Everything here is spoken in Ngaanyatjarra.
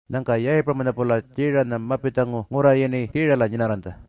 Nyangka Yayipuramanya-pula Tjiiranya mapitjangu ngurra yini Kiirala nyinarranytja.